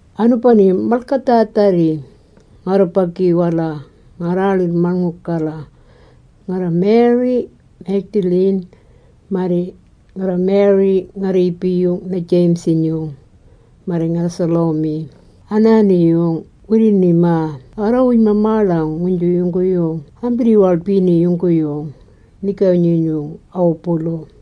Anubani-yung malgadhaadharri, ngarrubagi-wala ngarraaḻirr-maṉngulg-gala, ngarra-Mary Magdalene, marri ngarra-Mary nga-rriibi-yung na-James-inyung, marri ngarra-Salome, anaani-yung wirri-nimaa arrawuj-mamaaḻang, nguynju yungguyung ambirri-waḻbini yungguyung nigawi-nyinyung ana-wubulu.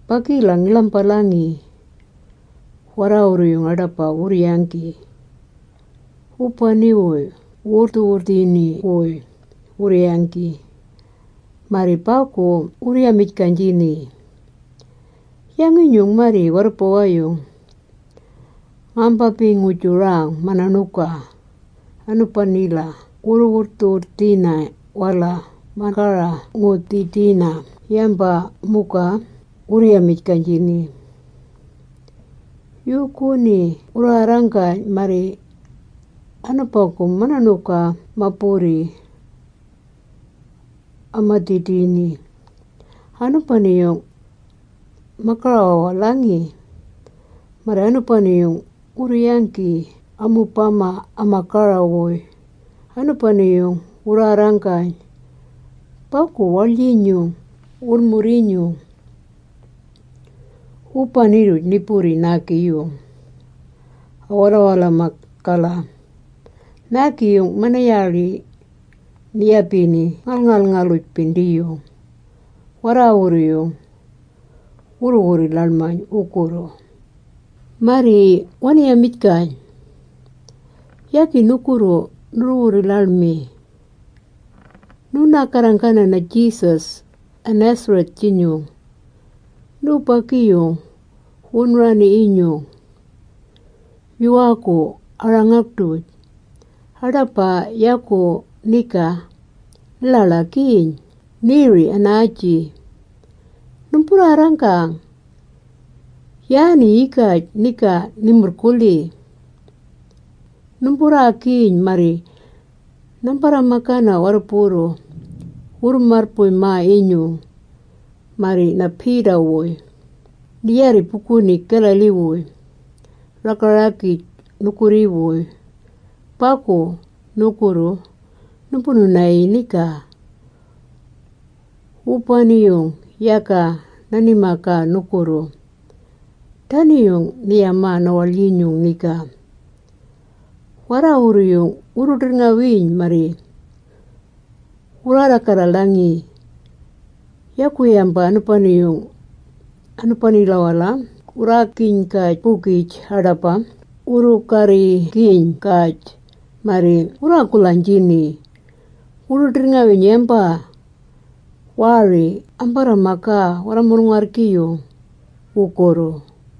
Bagila ngi-ḻambalangi. Warraawurru-yung aḏaba wurru-yanggi, wubani-wuy wuu-wurrdhu-wurrdhini-wuy wurru-yanggi. Marri bagu wurru-yamijgaynjini, “Yangi-nyung marri warrubawi-yung ngambambii-ngu-jurang mana-ṉuga anubanila wu-wurrdhu-wurrdhina-wala ma-gara-ngu-dhidina yamba muga?” wurru-yamijgaynjini. Yuuguni wurraarranggayn, maari anubagu mana-ṉuga ma-burri ama-dhidini. Anubani-yung ma-gara-wawalhangi. Marri anubani-yung wurru-yanggi amubama ama-gara-wuy, anubani-yung wurraarranggayn bagu waḻyinyung wulmurr-inyung. Wubani-rruj ni-burri naagi-yung a-walawalamag-gala. Naagi-yung mana-yaaḻi ni-yabini ngalngalngaluj-bindiyung. Warraawurru-yung wurru-wurri-ḻaḻmayn wugurru. Marri wani-yamijgayn, “Yagi nugurru nurru-wurri-ḻaḻmi. Nuunaa-garra-garranggana na-Jesus a-Nazareth-jinyung, nubagi-yung-jinyung wunu-raani-yinyung yuwaagu a-rangag-duj. Aḏaba yagu niga ni-ḻaḻagiiyn, niiri anaaji! Numburraarranggana, yaani yigaj niga ni-murrgulhi. Numburraagiyn marri nambarra-magana warruburru wurru-marrbuy-maa-yinyung, marri na-Peter-wuy, ni-yaarri buguni Galilee-wuy, raga-ragij nugurri-wuy. Bagu, nugurru numbunu-nayii niga, wubani-yung yaga nani-magaa nugurru.” Dani-yung ni-yamaa na-waḻyinyung niga. Warraawurru-yung wurru-ḏirrngawiiyn marri wurraarra-galalangi. Yagu yamba anubani-yung, anubanila wurraagiyn-gaj-bugij aḏaba wurru-garrigiyn-gaj marri wurraagulhaynjini, wurru-ḏirrngawiiyn yamba. Waari ambarra-magaa warra-mulung-arrgi-yung wugurru.